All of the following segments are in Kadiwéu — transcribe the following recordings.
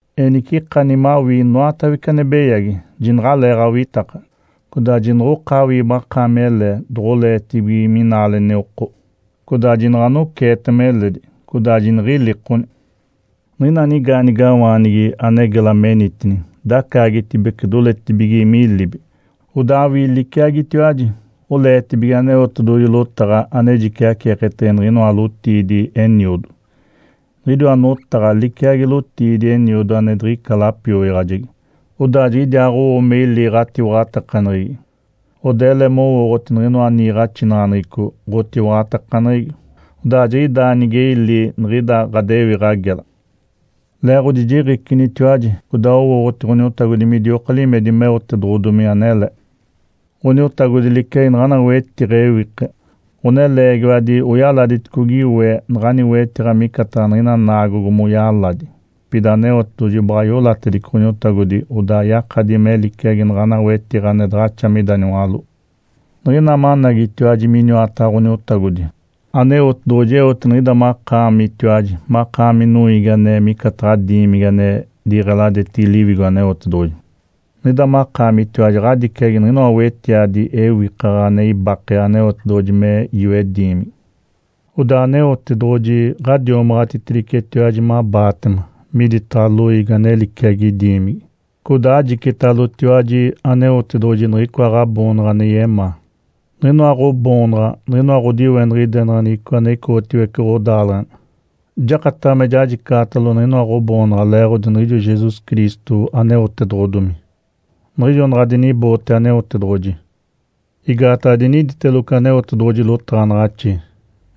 Enice ikani mawii inoatawece ane beyagi, jinaɡ̶alee awitaka, codaa jinoɡ̶okaawii makaami ele doɡ̶oleetibige minaaleni oko, codaa jinaɡ̶a anoceetema eledi, codaa jiniɡ̶ilikoni. Niɡ̶ina nigaanigawaanigi ane gela menitini dacaagetibece doletigi milibi, odaa awii liciagitiwaji, oleetibige Aneotedoɡ̶oji lotaɡ̶a ane jiciaceeketege niɡ̶inoa lotiidi eniodo. Niɡ̶idiwa notaɡ̶a liciagi lotiidi eniodo ane diɡ̶ica lapioyaɡ̶ajegi, odaa jiɡ̶idiaaɡ̶owo me ili ɡ̶atiwaɡ̶atakaneɡ̶egi, odaa ele mowooɡ̶oti niɡ̶inoa niiɡ̶axinaɡ̶aneɡ̶eco ɡ̶otiwaɡ̶atakaneɡ̶egi. Odaa jiɡ̶idaa nige ili niɡ̶ida ɡ̶adewiɡ̶a gela. Leeɡ̶odi jiɡ̶icinitiwaji codaa owooɡ̶oti Ǥoniotagodi midioka limedi meotedoɡ̶odomi anele. Ǥoniotagodi liciagi naɡ̶ana wetiɡ̶a ewike. Ǥoneleegiwadi oyaladiticogi we naɡ̶ani wetiɡ̶a micataɡ̶a niɡ̶ina naagogo moyaladi. Pida Aneotedoɡ̶oji baɡ̶a iolatedice Ǥoniotagodi odaa yakadi me liciagi naɡ̶ana wetiɡ̶a ane daɡ̶axa mida niwaló. Niɡ̶ina managitiwaji miniwataɡ̶a Ǥoniotagodi, Aneotedoɡ̶oji eote niɡ̶ida makaamitiwaji makaami noiigi ane micataɡ̶a diimigi ane diɡ̶eladetigi Liwigo Aneotedoɡ̶oji. Niɡ̶ida makaamitiwaji ɡ̶adiciagi niɡ̶inoa wetiadi ewikaɡ̶a ane ibake Aneotedoɡ̶oji me yoe diimigi. Odaa Aneotedoɡ̶oji ɡ̶adiomaɡ̶atitedicetiwaji mabaatema miditaɡ̶a loiigi ane liciagi diimigi. Codaa ajicitalotiwaji Aneotedoɡ̶oji niɡ̶icoa ɡ̶aboonaɡ̶a ane yemaa. Niɡ̶inoa ɡ̶oboonaɡ̶a niɡ̶inoa ɡ̶odiweniɡ̶idenaɡ̶aneɡ̶eco ane icoɡ̶otiwece ɡ̶odaaleɡ̶ena. Jakataɡ̶a me jajicaɡ̶atalo niɡ̶inoa ɡ̶oboonaɡ̶a leeɡ̶odi niɡ̶ijo Jesus Cristo aneotedoɡ̶odomi, niɡ̶ijo naɡ̶a diniboote Aneotedoɡ̶oji. Igaataɡ̶a diniditeloco Aneotedoɡ̶oji lotaɡ̶anaɡ̶axi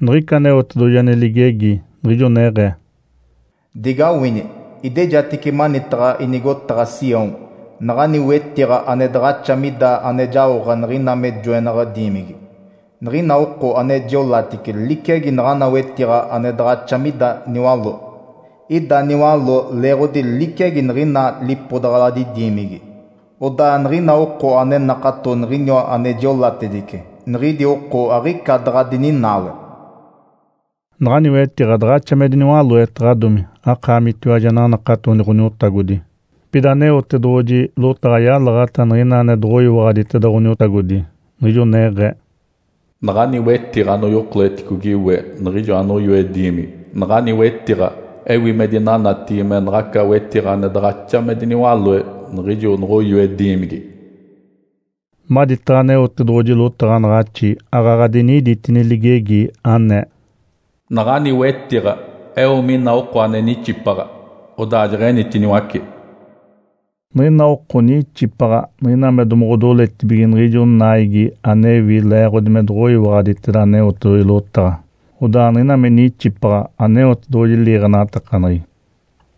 niɡ̶ica Aneotedoɡ̶oji ane ligegi, niɡ̶ijo neɡ̶ee, “Digawini! Idejatice manitaɡ̶a inigotaɡ̶a Sião naɡ̶ani wetiɡ̶a ane daɡ̶axa mida ane jaoɡ̶a niɡ̶ina me joenaɡ̶a diimigi. Niɡ̶ina oko ane jiolatice liciagi naɡ̶ana wetiɡ̶a ane daɡ̶axa mida niwaló. (Ida niwaló leeɡ̶odi liciagi niɡ̶ina lipodaɡ̶aladi diimigi.) Odaa niɡ̶ina oko ane nakato Niɡ̶iniwa ane jiolatice, niɡ̶idi oko aɡ̶ica daɡ̶a dininaale.” Naɡ̶ani wetiɡ̶a daɡ̶axa me diniwaloetaɡ̶adomi akaamitiwaji ananakatoni Ǥoniotagodi. Pida Aneotedoɡ̶oji lotaɡ̶a yalaɡ̶ata niɡ̶ina ane doɡ̶oyiwaɡ̶aditeda Ǥoniotagodi, niɡ̶ijo neɡ̶ee, “Naɡ̶ani wetiɡ̶a anoyokoleticogi we niɡ̶ijo anoyoe diimigi, naɡ̶ani wetiɡ̶a ewi me dinanatigi me naɡ̶aca wetiɡ̶a ane daɡ̶axa me diniwaloe niɡ̶ijo noɡ̶oyoe diimigi.” Maditaɡ̶a Aneotedoɡ̶oji lotaɡ̶anaɡ̶axi aaɡ̶aɡ̶a diniditini ligegi, anee, “Naɡ̶ani wetiɡ̶a eo mina oko ane nixipaɡ̶a, odaa jeɡ̶enitiniwace.” Niɡ̶ina oko nixipaɡ̶a niɡ̶ina me doɡ̶odoletibige niɡ̶ijo naigi anewi leeɡ̶odi me doɡ̶oyiwaɡ̶aditeda Aneotedoɡ̶oji lotaɡ̶a. Odaa niɡ̶ina me nixipaɡ̶a, Aneotedoɡ̶oji liiɡ̶enatakaneɡ̶egi.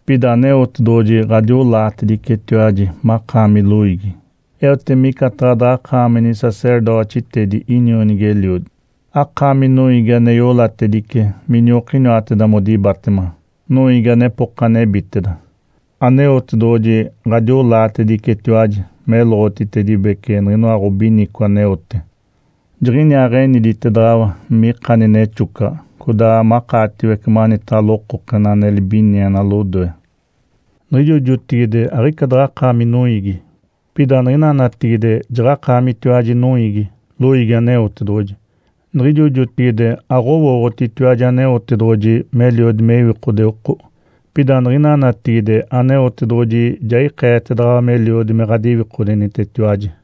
Pida Aneotedoɡ̶oji ɡ̶adiolaatedicetiwaji makaami loiigi, eote micataɡ̶a daɡ̶akaami nisacerdotitedi inionigi-eliodi, akaami noiigi ane iolatedice miniokiniwateda modibatema, noiigi anepoka nebiteda. Aneotedoɡ̶oji ɡ̶adiolaatedicetiwaji meloɡ̶otitedibece niɡ̶inoa ɡ̶obinico aneote, Jiɡ̶iniaa eniditedaɡ̶awa me ikani nexocaɡ̶a codaa makaatiwece manitaɡ̶a lokokena ane libiniena lodoe. Niɡ̶ijo jotigide aɡ̶ica daɡ̶akaami noiigi, pida niɡ̶ina natigide jaɡ̶akaamitiwaji noiigi, loiigi Aneotedoɡ̶oji. Niɡ̶ijo jotigide aɡ̶owooɡ̶otitiwaji Aneotedoɡ̶oji meliodi me iwikode oko, pida niɡ̶ina natigide Aneotedoɡ̶oji ja ikeetedaɡ̶awa meliodi me ɡ̶adiwikodenitetiwaji.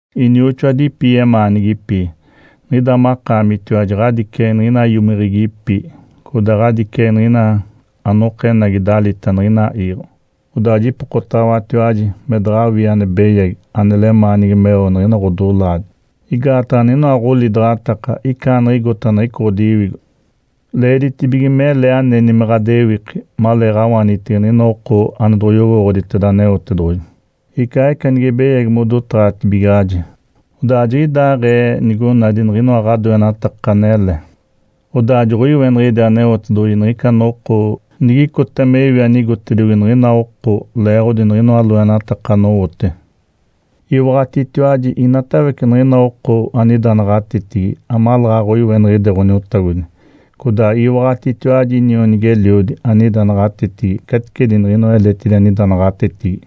Inioxoadipi yemaanigipi, niɡ̶ida makaamitiwaji ɡ̶adiciagi niɡ̶ina iomiɡ̶igipi codaa ɡ̶adiciagi niɡ̶ina anokenagi dalita niɡ̶ina iiɡ̶o. Odaa jipokotaɡ̶awatiwaji me daɡ̶awii ane beyagi ane lemaanigi meo niɡ̶ina ɡ̶odolaadi, igaataɡ̶a niɡ̶inoa ɡ̶olidaɡ̶ataka icaaniɡ̶igota niɡ̶ica ɡ̶odiwigo. Leeditibige mele aneni me ɡ̶adewiki maleeɡ̶awaanitege niɡ̶ina oko ane doɡ̶oyowooɡ̶oditeda Aneotedoɡ̶oji, icaaɡ̶ica nige beyagi modotaɡ̶atibigaɡ̶aji. Odaa jiɡ̶idaaɡ̶ee nigonadi niɡ̶inoa ɡ̶adoenataka anele, odaa joɡ̶oiweniɡ̶ide Aneotedoɡ̶oji niɡ̶ica noko nigicota me iwi anigotediogi niɡ̶ina oko leeɡ̶odi niɡ̶inoa loenataka anowote. Iwaɡ̶atitiwaji inatawece niɡ̶ina oko anida naɡ̶atetigi amaleeɡ̶aɡ̶a oiweniɡ̶ide Ǥoniotagodi. Codaa iwaɡ̶atitiwaji inionigi-eliodi, anida naɡ̶atetigi caticedi niɡ̶inoa eletidi anida naɡ̶atetigi.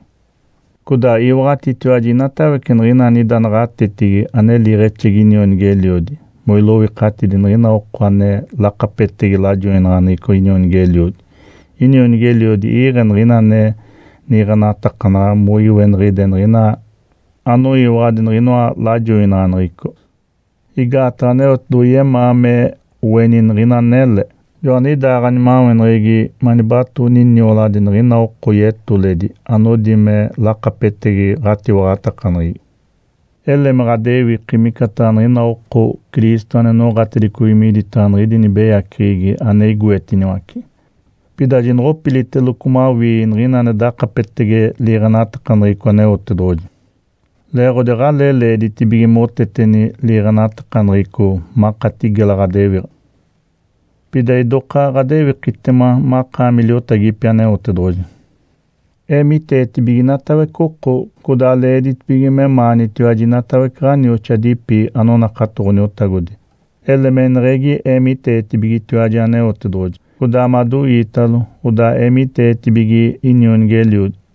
Codaa iwaɡ̶atitiwaji inatawece niɡ̶ina anida naɡ̶atetigi ane liiɡ̶exedi inionigi-eliodi moiloikatidi niɡ̶ina oko ane lakapetegi lajoinaɡ̶aneɡ̶eco inionigi-eliodi. Inionigi-eliodi iiɡ̶e niɡ̶ina ane niiɡ̶enatakanaɡ̶a moiweniɡ̶ide niɡ̶ina anoyiwaɡ̶adi niɡ̶ijoa lajoinaɡ̶aneɡ̶eco. Igaataɡ̶a Aneotedoɡ̶oji yemaa me oeni niɡ̶ina anele. Joaniɡ̶idaa ɡ̶animaweneɡ̶egi manibatooni nioladi niɡ̶ina oko yetoledi anodi me lakapetegi ɡ̶atiwaɡ̶atakaneɡ̶egi. Ele me ɡ̶adewiki micataɡ̶a niɡ̶ina oko Cristo ane noɡ̶atedicogi miditaɡ̶a niɡ̶idi nibeyaceɡ̶egi ane igoetiniwace. Pida jinoɡ̶opilitaceloco mawii niɡ̶ina ane dakapetege liiɡ̶enatakaneɡ̶eco Aneotedoɡ̶oji leeɡ̶odi aɡ̶alee leeditibige moteteni liiɡ̶enatakaneɡ̶eco makati gela ɡ̶adewiɡ̶a. Pida idoka ɡ̶adewikitema makaami liotagipi Aneotedoɡ̶oji. Eemiteetibige inatawece oko. Codaa leeditibige memaanitiwaji inatawece ɡ̶onioxoadipi anonakato Ǥoniotagodi. Ele meneɡ̶egi eemiteetibigetiwaji Aneotedoɡ̶oji codaa madoiitalo. Odaa eemiteetibige inionigi-eliodi.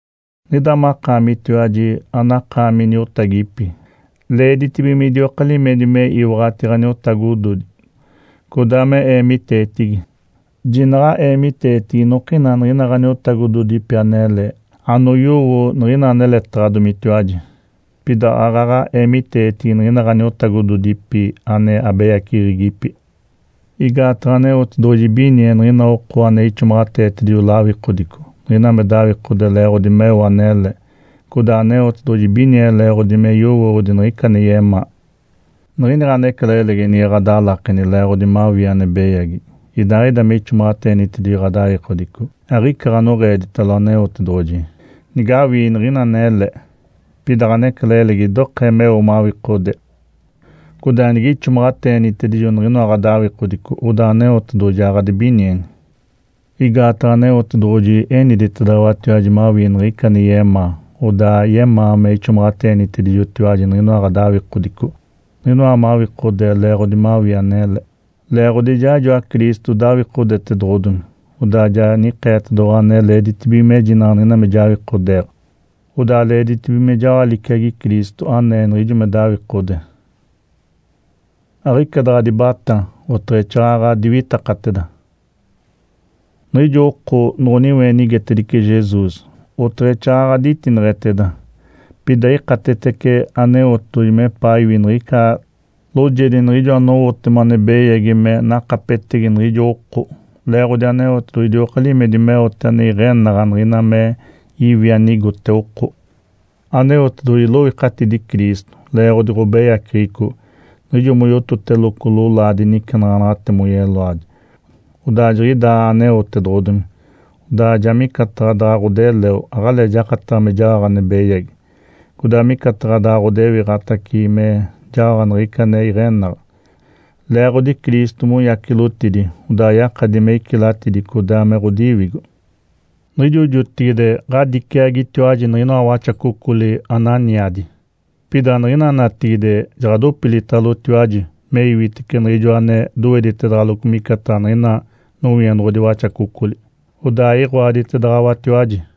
Niɡ̶ida makaamitiwaji anakaami niotagipi, leeditibige midioka limedi me iwaɡ̶ati ɡ̶aniotagododi, codaa me eemiteetigi. Jinaɡ̶a eemiteetigi inokina niɡ̶ina ɡ̶aniotagododipi anele anoyowo niɡ̶ina aneletaɡ̶adomitiwaji. Pida aaɡ̶aɡ̶a eemiteetigi niɡ̶ina ɡ̶aniotagododipi ane abeyaceɡ̶egipi. Igaataɡ̶a Aneotedoɡ̶oji ibinie niɡ̶ina oko ane ixomaɡ̶ateetedijo lawikodico niɡ̶ina me dawikode leeɡ̶odi meo anele, codaa Aneotedoɡ̶oji ibinie leeɡ̶odi me yowooɡ̶odi niɡ̶ica ane yemaa. Niɡ̶ini ɡ̶anecalailegi nige ɡ̶adalakeni leeɡ̶odi mawii ane beyagi, idaaɡ̶ida me ixomaɡ̶ateenitedijo ɡ̶adawikodico, aɡ̶ica ɡ̶anoɡ̶eeditalo Aneotedoɡ̶oji. Nigawii niɡ̶ina anele, pida ɡ̶anecalailegi idokee meo mawikodee, codaa nige ixomaɡ̶ateenitedijo niɡ̶inoa ɡ̶adawikodico, odaa Aneotedoɡ̶oji ja ɡ̶adibinieni. Igaataɡ̶a Aneotedoɡ̶oji eniditedaɡ̶awatiwaji mawii niɡ̶ica ane yemaa, odaa yemaa me ixomaɡ̶ateenitedijotiwaji niɡ̶inoa ɡ̶adawikodico, niɡ̶ina mawikodee leeɡ̶odi mawii anele. Leeɡ̶odi ijaaɡ̶ijoa Cristo dawikodetedoɡ̶odomi, odaa ja nikeetedoɡ̶owa ane leeditibige mejinaɡ̶a niɡ̶ina me jawikodeeɡ̶a. Odaa leeditibige me jaoɡ̶a liciagi Cristo anee niɡ̶ijo me dawikode. Aɡ̶ica daɡ̶a dibatá, oteɡ̶exaaɡ̶aɡ̶a diwitakateda. Niɡ̶ijo oko noɡ̶oniweenigetedice Jesus, oteɡ̶exaaɡ̶aɡ̶a ditineɡ̶eteda. Pida ikatetece Aneotedoɡ̶oji mepaa iwi niɡ̶ica loojedi niɡ̶ijo anowotema ane beyagi me nakapetegi niɡ̶ijo oko, leeɡ̶odi Aneotedoɡ̶oji idioka limedi meote ane iɡ̶enaɡ̶a niɡ̶ina me iwi anigote oko. Aneotedoɡ̶oji iloikatidi Cristo leeɡ̶odi ɡ̶obeyaceɡ̶eco niɡ̶ijo moyototedeloco lolaadi nicenaɡ̶anaɡ̶ate moyeloadi. Odaa jiɡ̶idaa aneotedoɡ̶odomi, odaa ja micataɡ̶a daɡ̶a ɡ̶odeleo aɡ̶alee jakataɡ̶a me jaoɡ̶a ane beyagi, codaa micataɡ̶a daɡ̶a ɡ̶odewiɡ̶atace me jaoɡ̶a niɡ̶ica ane iɡ̶enaɡ̶a. Leeɡ̶odi Cristo moyacilotidi, odaa yakadi me icilatidi codaa me ɡ̶odiwigo. Niɡ̶ijo jotigide ɡ̶adiciagitiwaji niɡ̶inoa waxacocoli ananiadi, pida niɡ̶ina natigide jaɡ̶adopilitalotiwaji me iwitece Niɡ̶ijoa ane doweditedaɡ̶aloco micataɡ̶a niɡ̶ina nowienoɡ̶odi waxacocoli, odaa iɡ̶oaditedaɡ̶awatiwaji.